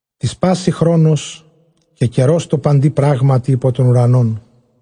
Τοῖς πᾶσιν ὁ χρόνος, καὶ καιρὸς τῷ παντὶ πράγματι ὑπὸ τὸν οὐρανόν.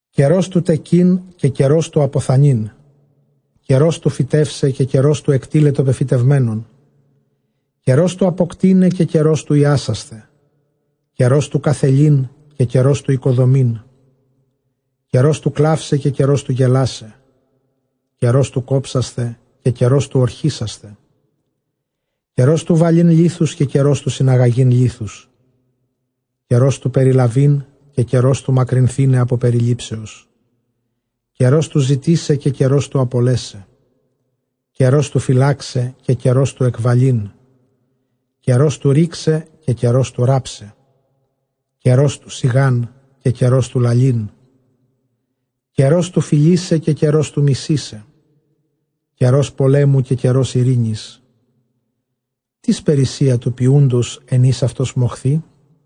Καιρὸς τοῦ τεκεῖν καὶ καιρὸς τοῦ ἀποθανεῖν, καιρὸς τοῦ φυτεῦσαι καὶ καιρὸς τοῦ ἐκτίλαι τὸ πεφυτευμένον· Καιρὸς τοῦ ἀποκτεῖναι καὶ καιρὸς τοῦ ἰάσασθαι, καιρὸς τοῦ καθελεῖν καὶ καιρὸς τοῦ οἰκοδομεῖν· Καιρὸς τοῦ κλαῦσαι καὶ καιρὸς τοῦ γελάσαι, καιρὸς τοῦ κόψασθαι καὶ καιρὸς τοῦ ὀρχήσασθαι· Καιρὸς τοῦ βαλεῖν λίθους καὶ καιρὸς τοῦ συναγαγεῖν λίθους, καιρὸς τοῦ περιλαβεῖν καὶ καιρὸς τοῦ μακρυνθῆναι ἀπὸ περιλήψεως· Καιρὸς τοῦ ζητῆσαι καὶ καιρὸς τοῦ ἀπολέσαι, καιρὸς τοῦ φυλάξαι καὶ καιρὸς τοῦ ἐκβαλεῖν· Καιρὸς τοῦ ῥῆξαι καὶ καιρὸς τοῦ ῥάψαι, καιρὸς τοῦ σιγᾷν καὶ καιρὸς τοῦ λαλεῖν· Καιρὸς τοῦ φιλῆσαι καὶ καιρὸς τοῦ μισῆσαι, καιρὸς πολέμου καὶ καιρὸς εἰρήνης. Τίς περίσσεια τοῦ ποιοῦντος ἐν οἷς αὐτὸς μοχθεῖ;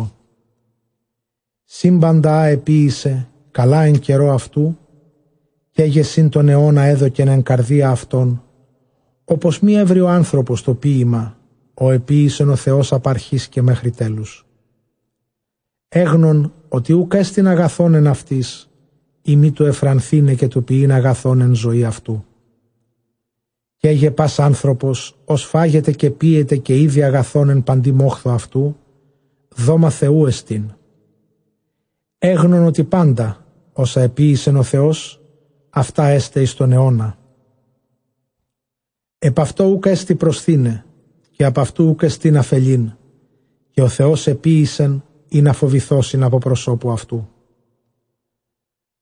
Τὰ σύμπαντα ἃ ἐποίησε καλὰ ἐν καιρῷ αὐτοῦ· καί γε σύμπαντα τὸν αἰῶνα ἔδωκεν ἐν καρδίᾳ αὐτῶν, ὅπως μὴ εὕρῃ ὁ ἄνθρωπος τὸ ποίημα ὁ ἐποίησεν ὁ Θεὸς ἀπʼ ἀρχῆς καὶ μέχρι τέλους. Ἔγνων ὅτι οὐκ ἔστιν ἀγαθὸν ἐν αὐτοῖς, εἰ μὴ τοῦ εὐφρανθῆναι καὶ τοῦ ποιεῖν ἀγαθὸν ἐν ζωῇ αὐτοῦ· Καί γε πᾶς ὁ ἄνθρωπος ὃς φάγεται καὶ πίεται, καὶ ἴδῃ ἀγαθὸν ἐν παντὶ μόχθῳ αὐτοῦ, δόμα Θεοῦ ἐστιν. Ἔγνων ὅτι πάντα ὅσα ἐποίησεν ὁ Θεὸς αὐτὰ ἔσται εἰς τὸν αἰῶνα, ἐπʼ αὐτῷ οὐκ ἔστι προσθεῖναι, καὶ ἀπʼ αὐτοῦ οὐκ ἔστιν ἀφελεῖν· καὶ ὁ Θεὸς ἐποίησεν, ἵνα φοβηθῶσιν ἀπὸ προσώπου αὐτοῦ.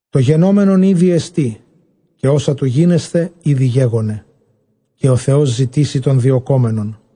Τὸ γενόμενον ἤδη ἐστί, καὶ ὅσα τοῦ γίνεσθαι ἤδη γέγονε, καὶ ὁ Θεὸς ζητήσει τὸν διωκόμενον.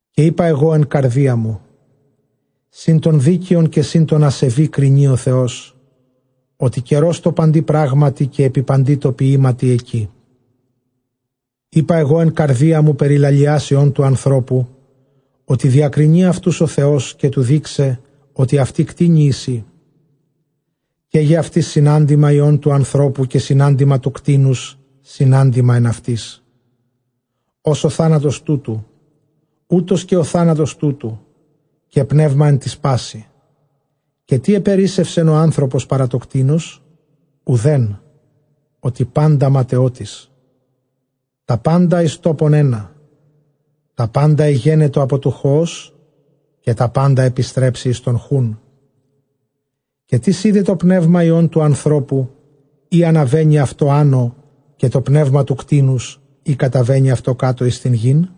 Καὶ εἶπα ἐγὼ ἐν καρδίᾳ μου, σὺν τὸν δίκαιον καὶ σὺν τὸν ἀσεβῆ κρινεῖ ὁ Θεός, ὅτι καιρὸς τῷ παντὶ πράγματι καὶ ἐπὶ παντὶ τῷ ποιήματι ἐκεῖ. Εἶπα ἐγὼ ἐν καρδίᾳ μου, περὶ λαλιᾶς υἱῶν τοῦ ἀνθρώπου, ὅτι διακρινεῖ αὐτοὺς ὁ Θεὸς, καὶ τοῦ δεῖξαι ὅτι αὐτοὶ κτήνη εἰσί. Καί γε αὐτοῖς συνάντημα υἱῶν τοῦ ἀνθρώπου, καὶ συνάντημα τοῦ κτήνους, συνάντημα ἓν αὐτοῖς· ὡς ὁ θάνατος τούτου, οὕτως καὶ ὁ θάνατος τούτου· καὶ πνεῦμα ἓν τοῖς πᾶσι· καὶ τί ἐπερίσσευσεν ὁ ἄνθρωπος παρὰ τὸ κτῆνος; οὐδέν· ὅτι πάντα ματαιότης. Τὰ πάντα εἰς τόπον ἕνα, τὰ πάντα ἐγένετο ἀπὸ τοῦ χοὸς, καὶ τὰ πάντα ἐπιστρέψει εἰς τὸν χοῦν. Καὶ τίς εἶδε πνεῦμα υἱῶν τοῦ ἀνθρώπου, εἰ ἀναβαίνει αὐτὸ ἄνω; καὶ τὸ πνεῦμα τοῦ κτήνους, εἰ καταβαίνει αὐτὸ κάτω εἰς γῆν;